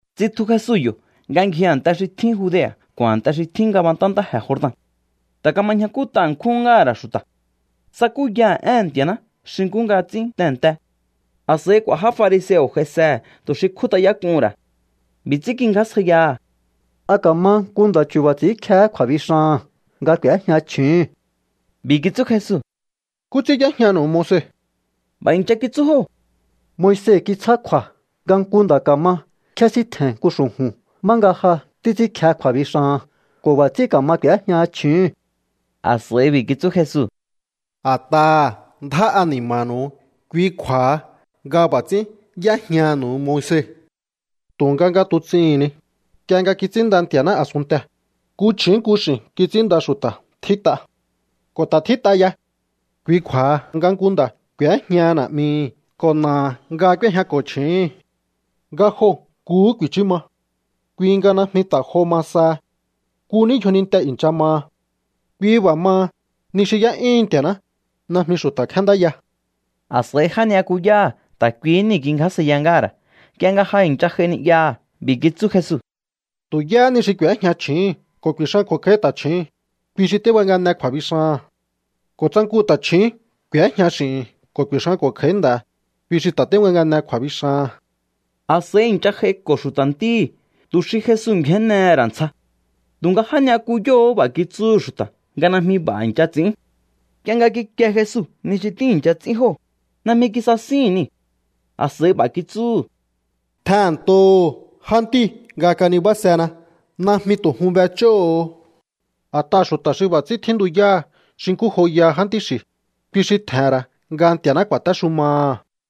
Tsitju Jesu yo̱ nga ngji a̱nte xi tjín Judea̱ ko̱ a̱nte xi tjín ngabantá ntáje̱ Jordan. Ta̱ kama ñjakút'a ṉkjúhún ngáha̱ ra̱ xu̱ta̱. Tsakúyaha̱ éhe̱n Nti̱a̱ná xi nkú nga ts'ín tehe̱nte. A̱s'a̱i k'u̱a̱ já fariseo̱ j'aisehe̱ tu̱ xi kjút'ayák'uhu̱n ra̱. B'i̱ ts'ín kingjásjaiyaha̱: —¿A ka̱ma nku nda̱ chu̱ba̱ ts'i̱ínkjehé kju̱a̱bixaha̱n nga k'u̱éjña chju̱úhu̱n? B'i̱ kitsú Jesu: —¿Nkú ts'ín y'éjñanu̱u Moise? B'a̱ i̱ncha kitsú jóo̱: —Moise kitsjá kju̱a̱ nga nku nda̱ ka̱ma kjésíntje̱n nku xu̱ju̱n má nga ja títs'ínkje kju̱a̱bixaha̱n ko̱ b'a̱ ts'ín ka̱ma k'u̱éjñaha chju̱úhu̱n. A̱s'a̱i b'i̱ kitsú Jesu: —A̱t'aha̱ ndjá ani̱ma̱nu̱u, kui kju̱a̱ha nga b'a̱ ts'ín y'éjnaha̱nu̱u Moise. Tu̱nga nga tuts'ihi̱n ni, nk'ie nga kits'ínnda Nti̱a̱ná a̱sunntee̱, “nku chju̱ún nku x'i̱n kits'ínnda xu̱ta̱” tjít'a. Ko̱ ta̱ tjít'a ya: “Kui kju̱a̱ha nga nku nda̱ k'u̱éjñaha na̱'mihi̱ ko̱ na̱aha̱ nga k'úéjñako̱ chju̱úhu̱n. Nga joo̱ nkuhú ku̱i̱chú ma.” Kui nga najmi ta̱ jo ma saha. Nku ní yjoninte i̱ncha maha. Kui b'a̱ maha, ni xi y'é'yúhun Nti̱a̱ná, najmi xu̱ta̱ kjéndáya. A̱s'a̱i já ni'yakuyáha̱ ta̱ kuihí niu̱ kingjásjaiya ngáha̱ ra̱ nk'ie nga ja i̱ncha j'ai ni'yaha̱. B'i̱ kitsú Jesu: —Tu̱ yáhá ni xi k'u̱éjña chju̱úhu̱n ko̱ ku̱i̱xanko̱ kj'a̱í ta̱chju̱ún, kui xi tíbangane kju̱a̱bixaha̱n. Ko̱ tsa nku ta̱chju̱ún k'u̱éjña x'i̱hi̱n ko̱ ku̱i̱xanko̱ kj'a̱í nda̱, kui xi ta̱ tíbangane kju̱a̱bixaha̱n. A̱s'a̱i i̱ncha j'aiko̱ xu̱ta̱ ntíhi̱ tu̱ xi Jesu ngju̱énnehe̱ ra̱ ntsja. Tu̱nga já ni'yakuyóo̱hó b'a̱ kitsúhu̱ xu̱ta̱ nga najmi b'a̱ i̱ncha ts'i̱ín. Nk'ie nga kikie Jesu ni xi tíi̱ncha ts'ín jóo̱, najmi kisasíhi̱n niu̱. A̱s'a̱i b'a̱ kitsúhu̱: —Tjehe̱nntoho̱o jántíu̱ nga kanibásena. Najmi tu̱ jun b'ech'óho̱o. A̱t'aha̱ xu̱ta̱ xi b'a̱ ts'ín tjíntuyáha̱ xi nkú joyaha jántí xi̱, kui xi tje̱he̱n ra̱ nga Nti̱a̱ná ku̱a̱téxumaha̱.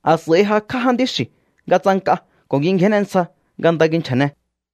A̱s'a̱i jakj'á jántí xi̱u̱ nga ts'ank'a ko̱ kingjénne ntsja nga nda kinchja̱ne.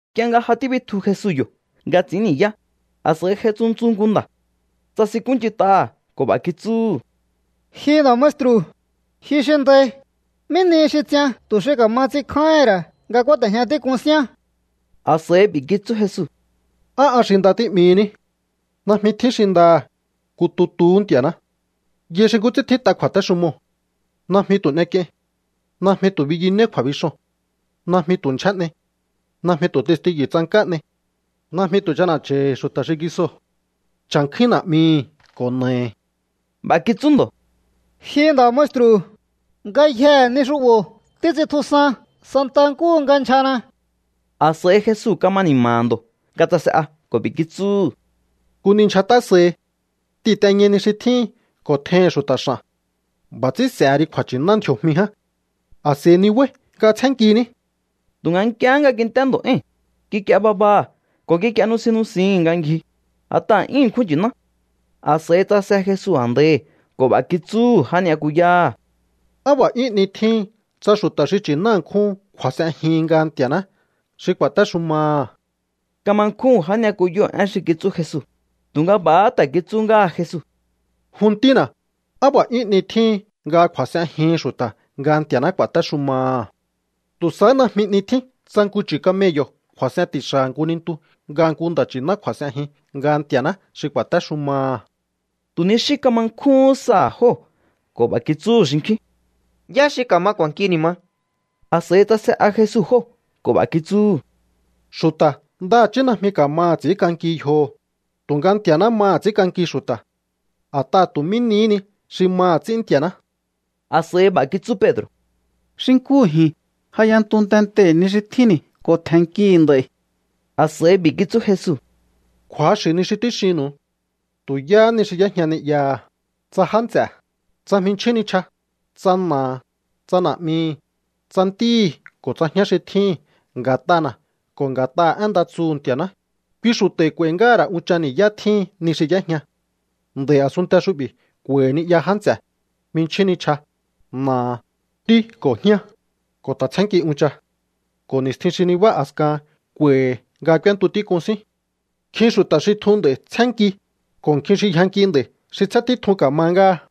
Nk'ie nga ja tíbitju Jesu yo̱ nga ts'i̱ín ni̱yá, a̱s'a̱i j'ai tsuntsu nku nda̱. Tsasinkúnch'int'aha̱ ko̱ b'a̱ kitsúhu̱: —Ji nda̱ maestru̱, ji xi ndai, ¿mí nihi xi ts'ian tu̱ xi ka̱ma ts'inkjáíhi̱n ra̱ nga kúáte̱jña tík'un síán? A̱s'a̱i b'i̱ kitsú Jesu: —¿Á an xi nda tí'mihiní? Najmi tjín xi ndaha̱, nku tutuhú Nti̱a̱ná. Yai xi nkú ts'ín tjít'a kju̱a̱téxumoo̱: “Najmi tu̱ n'ek'iein. Najmi tu̱ biyunéí kju̱a̱bixoo̱n. Najmi tu̱ ndyjé n'ei. Najmi tu̱ testiyu̱ tsank'á n'ei. Najmi tu̱ ch'ana̱ch'a̱i̱hi̱ xu̱ta̱ xingisoo̱. Cha̱nkjúín na̱'mihi̱ ko̱ na̱ahi̱.” B'a̱ kitsú ndo̱: —Ji nda̱ maestru̱, ngayjee̱ ni xu'bo̱ títs'intjusan santa nkúhu nga ndyjana. A̱s'a̱i Jesu kama ni̱ma̱ha̱ ndo̱ nga tsase'a ko̱ b'i̱ kitsúhu̱: —Nku ni ndyjat'a sahi. T'ihi̱nteñai ni xi tjíhin ko̱ tjeihi̱n xu̱ta̱ x'a̱n. B'a̱ ts'ín s'e̱he ri kju̱a̱nchi̱ná ndji̱o̱jmi ján. A̱s'a̱i ni̱báí nga tsjénnkiní. Tu̱nga nk'iehé nga kint'é ndo̱ éi̱n, kik'ie babaha̱ ko̱ kik'ie nusin nusihi̱n nga ngji, a̱t'aha̱ 'yún ṉkjún nchi̱ná. A̱s'a̱i tsase Jesu a̱ndaihi̱ ko̱ b'a̱ kitsúhu̱ já ni'yakuyáha̱: —¡Á b'a̱ 'yún 'ni tjíhin tsa xu̱ta̱ xi nchi̱ná ṉkjúhun kju̱a̱s'enjihin nga Nti̱a̱ná xi ku̱a̱téxumaha̱! Kama nkjúhu̱n já ni'yakuyóo̱ én xi kitsú Jesu, tu̱nga b'a̱há ta̱ kitsú ngáha̱ Jesu: —Jun ntína̱, ¡á b'a̱ 'yún 'ni tjíhin nga kju̱a̱s'enjihin xu̱ta̱ nga Nti̱a̱ná ku̱a̱téxumaha̱! Tu̱ sahá najmi 'ni tjín tsa nku chu̱ camello̱ kju̱a̱s'en ti̱xa̱ha̱ nku nintu nga nku nda̱ nchi̱ná kju̱a̱s'enjin nga Nti̱a̱ná xi ku̱a̱téxumaha̱. Tu̱ ni xí kama nkjúhún saha̱ jóo̱ ko̱ b'a̱ kitsúhu̱ xinkjín: —¿Yá xi ka̱ma k'u̱a̱nki ni̱ ma? A̱s'a̱i tsase'a Jesu jóo̱ ko̱ b'a̱ kitsúhu̱: —Xu̱ta̱ ndaha̱chí najmi ka̱maha̱ ts'i̱ínk'anki yjoho̱, tu̱nga Nti̱a̱ná maha̱ ts'ínk'anki xu̱ta̱. A̱t'aha̱ tu̱ mí nihí ni xi maha̱ ts'ín Nti̱a̱ná. A̱s'a̱i b'a̱ kitsú Pedro̱: —Xi nkúhu ji̱n, ja y'entu tentei̱ ni xi tjínni̱ ko̱ tje̱nnkihi̱ nd'a̱i̱. A̱s'a̱i b'i̱ kitsú Jesu: —Kju̱axi̱ ni xi tíxinnu̱u. Tu̱ yáhá ni xi y'éjña ni'yaha̱, tsa já nts'e̱, tsa jminchjín nichja, tsa na̱aha̱, tsa na̱'mihi̱, tsa ntíhi̱ ko̱ tsa jñá xi tjíhi̱n nga̱t'ana̱ ko̱ nga̱t'aha̱ én nda tsuhu̱ Nti̱a̱ná, kui xu̱ta̱i̱ k'u̱a̱i̱ ngáha̱ ra̱ unchan ni̱yá tjíhin ni xi y'éjña. Nd'a̱i̱ a̱sunnte xu'bi̱ k'u̱a̱i̱hi̱ ni'ya, já nts'e̱, jminchjín nichja, na̱aha̱, ntí ko̱ jñá, ko̱ ta̱ tsjénnki uncha. Ko̱ ni̱stjin xi nibá a̱skahan k'u̱a̱i̱hi̱ nga k'úéntu tík'un sín. Nkjin xu̱ta̱ xi tjun nd'a̱i̱ tsjénnki, ko̱ nkjin xi yjanki nd'a̱i̱ xi tsjén títjun ka̱ma ngáha.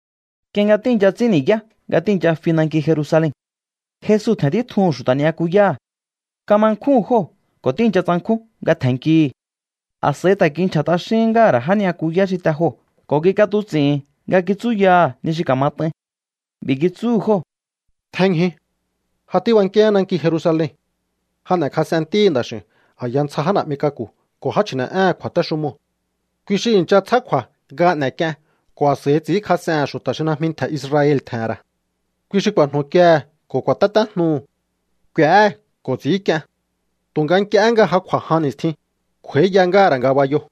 Nk'ie nga tíi̱ncha ts'ín ni̱yá nga tíi̱ncha fi nanki Jerusalen, Jesu tje̱n títjuhu̱n xu̱ta̱ ni'yakuyáha̱. Kama nkjúhu̱n jóo̱ ko̱ tíi̱ncha tsankjún nga tje̱nnkihi̱. A̱s'a̱i ta̱ kinchja̱ t'axíhín ngáha̱ ra̱ já ni'yakuyá xi te joo̱ ko̱ kik'atuts'i̱hi̱n nga kitsúyaha̱ ni xi ka̱mat'ain. B'i̱ kitsúhu̱ jóo̱: —Tjenñju. Ja tíbankíaán nanki Jerusalen. Ja n'e̱kjas'en Ntíhi̱ Nda̱x'i̱u̱n a̱ya ntsja já na̱'mi k'aku̱ ko̱ já chji̱ne̱'éhe̱n kju̱a̱téxumoo̱. Kui xi i̱ncha tsjá kju̱a̱ nga n'e̱k'ien ko̱ a̱s'a̱i ts'i̱ínkjas'ehe̱n xu̱ta̱ xi najmi ntje̱ Israel tje̱he̱n ra̱. Kui xi ku̱a̱jnu̱kiehe̱ ko̱ ku̱a̱tétéjnuhu̱. K'u̱éhe̱ ko̱ ts'i̱ínk'ien. Tu̱nga nk'iehé nga ja kj'u̱a̱ jan ni̱stjin, kj'u̱a̱íya ngáha̱ ra̱ ngabayoo̱.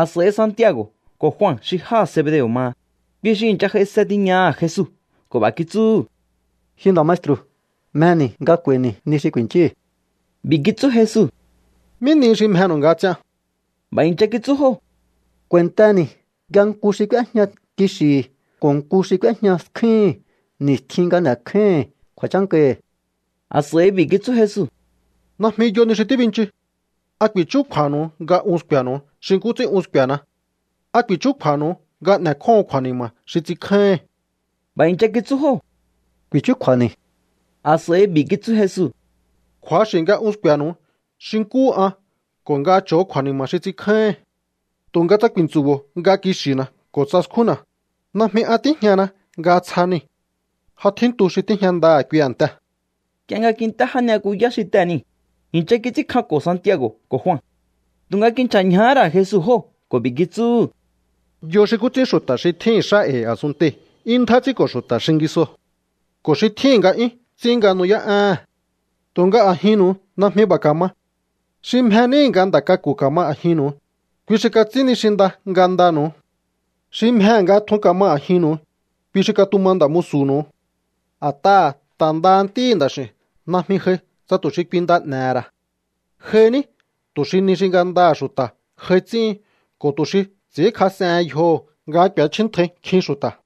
A̱s'a̱i Santiago̱ ko̱ Jua xi jáha̱ Zebedeo̱ maha, kui xi i̱ncha j'aise tiñaha̱ Jesu ko̱ b'a̱ kitsúhu̱: —Ji nda̱ maestru̱, mjeni̱ nga k'u̱a̱i̱ni̱ ni xi ku̱i̱nchíhi̱. B'i̱ kitsú Jesu: —¿Mí nihi xi mjenu̱u nga ts'ian? B'a̱ i̱ncha kitsú jóo̱: —K'u̱a̱i̱nteni̱ nga nku xi k'úéjña kixi̱hi̱ ko̱ nku xi k'úéjña skjúhi̱n ni̱stjin nga n'e̱kjáíhi̱n kju̱a̱chákahi̱. A̱s'a̱i b'i̱ kitsú Jesu: —Najmi yo ni xi tíbinchu. ¿A ku̱i̱chúkju̱a̱nu̱u nga un sku̱e̱nu̱u xi nkú ts'ín un sku̱e̱na? ¿A ku̱i̱chúkju̱a̱nu̱u nga n'e̱kjóho̱on kju̱a̱ni̱ma̱ xi ts'inkjáíhi̱n? B'a̱ i̱ncha kitsú jóo̱: —Ku̱i̱chúkju̱a̱ni̱. A̱s'a̱i b'i̱ kitsú Jesu: —Kju̱axi̱ nga un sku̱e̱nu̱u xi nkúhu an ko̱ nga cho̱o kju̱a̱ni̱ma̱ xi ts'inkjáíhi̱n. Tu̱nga tsa ku̱i̱ntsu̱bo̱o nga kixi̱na̱ ko̱ tsa skjúnna̱, najmi an tíjñana nga tsja niu̱. Ja tjíntu xi tíjña ndaha̱ kui a̱ntee̱. Nk'ie nga kint'é já ni'yakuyá xi tee̱ niu̱, i̱ncha kits'ínkjanko̱ Santiago̱ ko̱ Jua. Tu̱nga kinchja̱ ñjahá ra̱ Jesu jóo̱ ko̱ b'i̱ kitsúhu̱: —Yo xi nkú ts'ín xu̱ta̱ xi tjíhi̱n xá e̱i̱ a̱sunntei̱ 'yún ndjá ts'ínko̱ xu̱ta̱ xingisoo̱, ko̱ xi tjíhi̱n nga'yún ts'ín nga nu'yá'éhe̱n. Tu̱nga a̱jinnu̱u najmi b'a̱ ka̱ma. Xi mje níhi̱ nga nda̱ k'aku̱ ka̱ma a̱jinnu̱u, kui xi kats'ín ni xi nda ngandanu̱u. Xi mjehe̱ nga tjun ka̱ma a̱jinnu̱u, kui xi katuma nda̱ musu̱nu̱u. A̱t'aha̱ ta̱ ndaha Ntíhi̱ Nda̱x'i̱u̱n najmi j'ai tsa tu̱ xi kui nda n'e̱he̱ ra̱. J'ai ní tu̱ xi ni xi ngandaha̱ xu̱ta̱ j'ai ts'íhin ko̱ tu̱ xi ts'i̱ínkjas'ehen yjoho̱ nga k'u̱échjíntjai nkjin xu̱ta̱.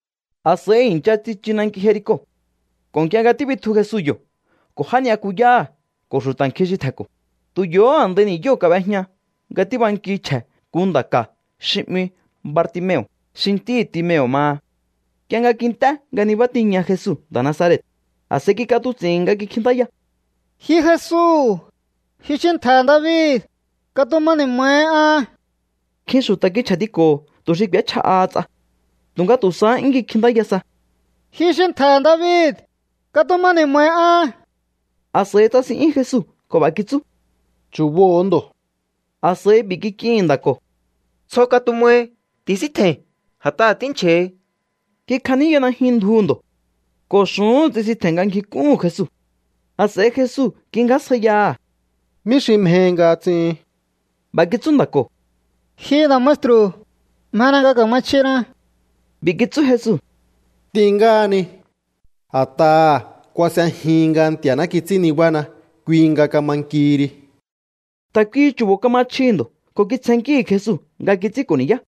A̱s'a̱i i̱ncha tsichu nanki Jerico. Ko̱ nk'ie nga tíbitju Jesu yo̱ ko̱ já ni'yakuyáha̱ ko̱ xu̱ta̱ nkjin xi tje̱nko̱, tu̱ yo̱hó a̱ndai ni̱yóo̱ kab'ejña nga tíbanki chje̱ nku nda̱ ka̱ xi 'mi Bartimeo̱, xi ntíhi̱ Timeo̱ maha. Nk'ie nga kint'é nga nibá tiña Jesu nda̱ Nazaret, a̱s'a̱i kik'atuts'i̱hi̱n nga kikjintáya: —¡Ji Jesu, ji xi ntje̱he̱ David, katuma ni̱ma̱hi an! Nkjin xu̱ta̱ kinchja̱tiko̱ho̱ tu̱ xi k'u̱échja'aha ts'a. Tu̱nga tu̱ sahá 'yún kikjintáya sa: —¡Ji xi ntje̱he̱ David, katuma ni̱ma̱hi an! A̱s'a̱i tsasin'yún Jesu ko̱ b'a̱ kitsú: —Chu̱boho̱o ndo̱. A̱s'a̱i b'i̱ kik'ihi̱n nda̱ ko̱: —Tsjo katumahi. Ti̱síntje̱i̱n, a̱t'aha̱ tínchja̱hi. Kikjaníya najyun ndjuhu̱ ndo̱ ko̱ xu̱úhu̱n tsisintje̱n nga ngjik'úhu̱n Jesu. A̱s'a̱i Jesu kingjásjaiyaha̱: —¿Mí xi mjehi nga ts'ihin? B'a̱ kitsú nda̱ ko̱: —Ji nda̱ maestru̱, mjena nga ka̱ma chjina. B'i̱ kitsú Jesu: —T'in ngáhani. A̱t'aha̱ kuas'ejihin nga Nti̱a̱ná kits'ín nibána, kui nga kama nkihi ri. Ta̱ kuihi chu̱bo̱ kama chjihi̱ ndo̱ ko̱ kitsjennkíhi̱ Jesu nga kits'ínko̱ ni̱yá.